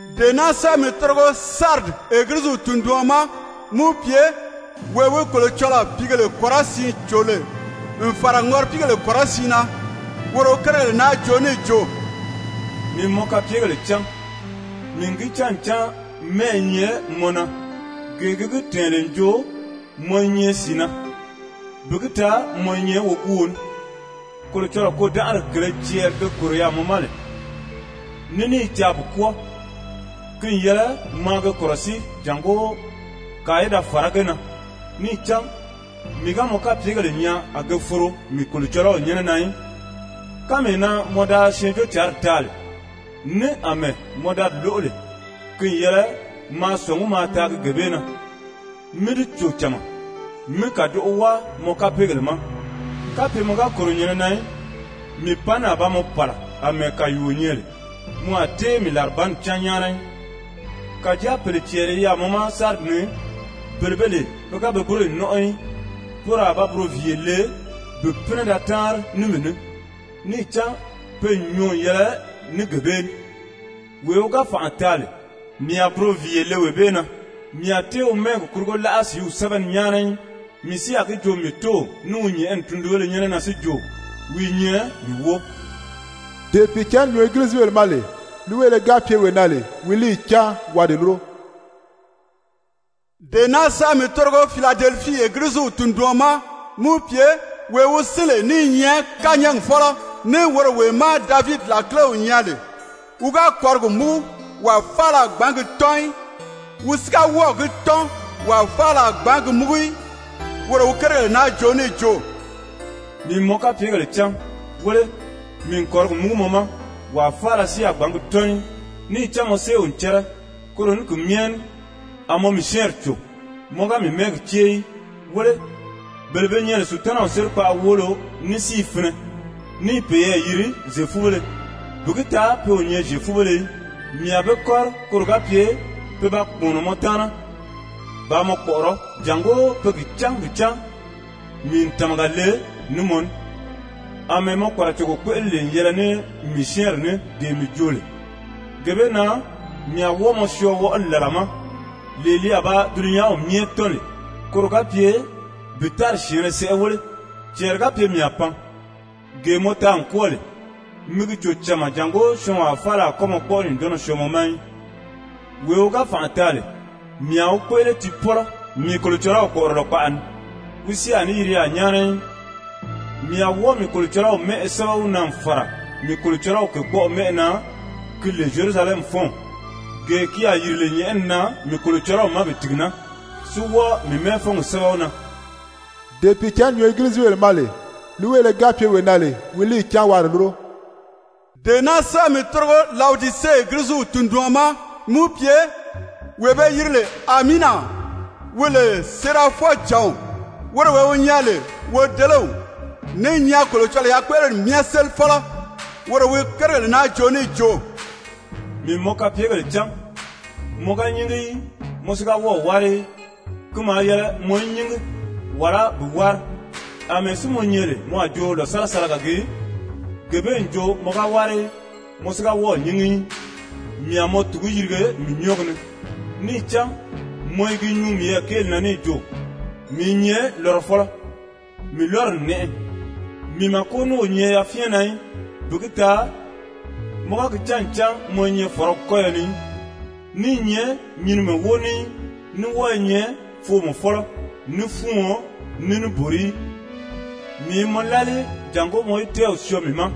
«Dee naa sɛ́bɛ mi tórigo Saridi Egiliziw tunduɔn ma, mí wi pye: ‹Wee wi Kolocɔlɔɔ pìígèle kɔrɔsiin cò lè n fàra ŋɔripiigèle kɔrɔsiin na, woro wi kérigèle naa joo níì jo: Mii n mɔ kapyegèle cán, mii n gi cán ncan mɛ́ʔɛ i nyɛ mɔ na gee gi gi tɛ̀ɛn lè n jo mɔ i nyɛ sìi na, bi gi taa mɔ i nyɛ woguuo ní. Kolocɔlɔɔ kôdanʔari kèlē cɛɛri ge kòro yaà mɔ ma lè ní ní i caa bi kwɔ́ɔ, ki n yɛlɛ maa ge kɔ̀rɔsíi jàngó kàa í da fàrá ge na, níì cán mii ga mɔ kapyegèle nyaa a ge foro mii Kolocɔlɔw nyɛ́nɛ na í. Kánmee na mɔ da Syɛɛnjóocǎnri taa lè, ní àmɛɛ mɔ da di lóʔo lè, ki n yɛlɛ maa sɔ̀ngí maa taagi gee bee na, mí di cò cama, mí kàdoʔo wáa mɔ kapeegèle ma. Kapye mɔ ga kòro nyɛ̀nɛ na í, mii panni a ba mɔ pàla àmɛɛ kàyuuo nyɛ lè, mɔ a tée mii làribanni cán nyáana í. Kàjáa pèle cɛɛri i yaà mɔ ma Saridi ni, bele be lè pe ga pe búroyi nɔ́nʔɔ í. Poro a ba buroviiye le bi pínɛ da táanri ní mii ní, níì cán pe n nyɔɔ n yɛlɛ ní gee bee ní. Wee wi ga fànʔa taa lè, mii a buroviiye le wee bee na, mii a tée wi mɛ́ɛgi kurugo láʔa sìíw sɛ́bɛ ni nyáana í, mii si a gi joo mii Tóow ní wi nyɛ̀ʔɛni tundunbéle nyɛ́nɛ na si jo: Wi i nyɛ mii wóo. Dee Pìicǎnni nyuu Egilizibèle ma lè, líiweele ga pye wee na lè, wi líiyi cáan waa di lúro.› «Dee naa sɛ́bɛ mi tórigo Filadelifii Egiliziw tunduɔn ma, mí wi pye: ‹Wee wi sín lè ní i nyɛ kányɛɛgi fɔ́lɔ, ní woro wee má Davidi làkilew nyɛ lè, wi ga kɔ̀rigi múgu wàa faala a gbǎn gi tɔ́n í, wi si ga wɔ́ɔ̀ gi tɔ́n wàa faala a gbǎn gi múgu í, woro wi kérigèle naa joo níì jo: Mii n mɔ kapyegèle cán. Wéle, mii n kɔ̀rigi múgu mɔ ma, wàa faala si a gbǎn gi tɔ́n í, níì cán mɔ séew n cɛ́rɛ, koro ní ki myɛ ní a mɔ mii syɛ́ɛnri cò, mɔ ga mii mɛ́ɛgi cée í. Wéle, bele be nyɛ lè Sutanaw sérikpaʔa woolo ní si i finɛ, ní i peyɛɛ yiri Zyefubéle, bi gi taa pe o nyɛ Zyefubéle í, mii a be kɔ́ri koro ga pye pe ba kpùmɔnɔ mɔ taana bàā mɔ kpɔ̀ʔɔrɔ́, jàngó pe gi cán bi cán mii n tàmaga le ní mɔ ní. Amɛɛ mɔ kpàracogo kpéʔele lè n yɛlɛ ní mii syɛ́ɛnri ní dee mii joo lè, gee bee na mii a wɔ́ɔ mɔ syɔɔ wɔʔɔli làla ma, lee li a ba dulunyanw myɛ tɔ́n lè, koro ga pye bi tári syɛ̀ɛnnɛ sɛʔɛ wéle. Cɛɛri ga pye mii a pan. Gee mɔ taa n kwɔ́ɔ lè, mi gi cò cama jàngó syɔɔnwaa faala a kɔ́ mɔ kpɔ́ʔɔri nyùndɔnnɔ syɔɔ mɔ ma í. Wee wi ga fànʔa taa lè, mii a wi kpéʔele tiipɔlɔ mii Kolocɔlɔw kpɔ̀ʔɔrɔlɔ kpaʔa ni, wi si a ní yiri yaà nyáana í. Mii a wɔ́ɔ mii Kolocɔlɔw mɛ́ʔɛ sɛ́bɛ wi na n fàra mii Kolocɔlɔw kèkpɔʔɔ mɛ́ʔɛ na, ki lè Zyerusalɛmifɔnw gee ki a yìri lè nyɛ̀ʔɛni na mii Kolocɔlɔw ma bi tìgi naa, si wɔ́ɔ mii mɛ́ɛfɔngi sɛ́bɛ wi na. Dee Pìicǎnni nyuu Egilizibèle ma lè, líiweele ga pye wee na lè, wi líiyi cáan waa di lúro.› «Dee naa sɛ́bɛ mi tórigo Lawodise Egiliziw tunduɔn ma, mí wi pye: ‹Wee be yiri lè Amiina, wi lè séerafɔjǎnw, woro wee wi nyɛ lè wodelew, ní i nyɛ Kolocɔlɔɔ yakpéʔeleri myɛ sélifɔlɔ, woro wi kérigèle naa joo níì jo: Mii n mɔ kapyegèle cán, mɔ ga nyíngi í, mɔ si ga wɔ́ɔ̀ wári í. Ki maa yɛlɛ mɔ í nyíngi, wàlá bi wári! Amɛɛ si mɔ nyɛ lè mɔ a jo lòsalasalaga gii, gee bee n jo mɔ ga wári í, mɔ si ga wɔ́ɔ̀ nyíngi í, mii a mɔ tùgu yirige mii nyɔ́ɔgi ni. Níì cán mɔ i gi nyuu miyɛɛ kéeli na níì jo: Mii i nyɛ lɔrɔfɔlɔ, mii lɔ́ri n nɛʔɛ, mii màko ní o nyɛ yafyɛn na í, bi gi taa mɔ ga gi cán ncan mɔ i nyɛ fɔ̀rɔgi kɔ́yɔ ni í, ní i nyɛ nyinimɛ wóo ní í, ní wɔ́ɔ i nyɛ foomɔfɔlɔ, ní fúuɔn, ní níbori í. Mii i mɔ lálii jàngó mɔ í tɛ́ɛw syɔɔ mii ma,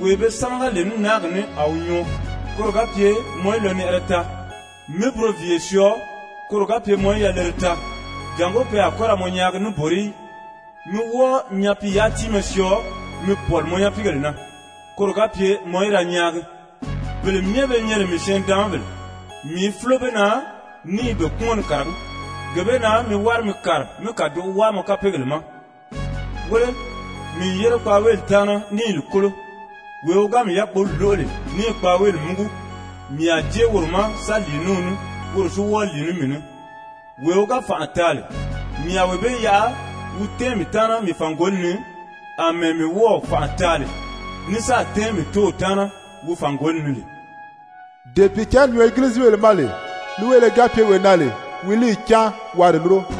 wee be sámaga lè ní náagi ní a wi nyɔɔ, koro ga pye mɔ í lɔnɛʔɛrɛ taa, mí buroviiye syɔɔ koro ga pye mɔ í yalere taa, jàngó pe a kɔ́ ra mɔ nyaagi níbori í, mí wɔ́ɔ nyapiiyáa-tíinmɛ syɔɔ mi pɔ̀li mɔ nyapiigèle na, koro ga pye mɔ í da nyaagi. Bele myɛ be nyɛ lè mii syɛɛn-nidaanmabèle, mii i fúlo be na ní i be kpúmɔn ni kàragí. Gee bee na mi wári mi kàri mi kàdoʔo wáa mɔ kapeegèle ma! Wéle, mii n yére kpaaweeli taana ní i li kólo. Wee wi ga mii yákpoli lóʔo lè níì kpaaweeli múgu, mii a jée woro ma sa lìi ní wi ní, woro si wɔ́ɔ lìi ní mii ní. Wee wi ga fànʔa taa lè, mii a wee bee yaʔa wi tɛ́ɛn mii taana mii fàngoli ni, àmɛɛ mii wɔ́ɔ̀ fànʔa taa lè ní sáà tɛ́ɛn mii Tóow taana wi fàngoli ni lè. Dee Pìicǎnni nyuu Egilizibèle ma lè, líiweele ga pye wee na lè, wi wi líiyi cáan waa di lúro.›»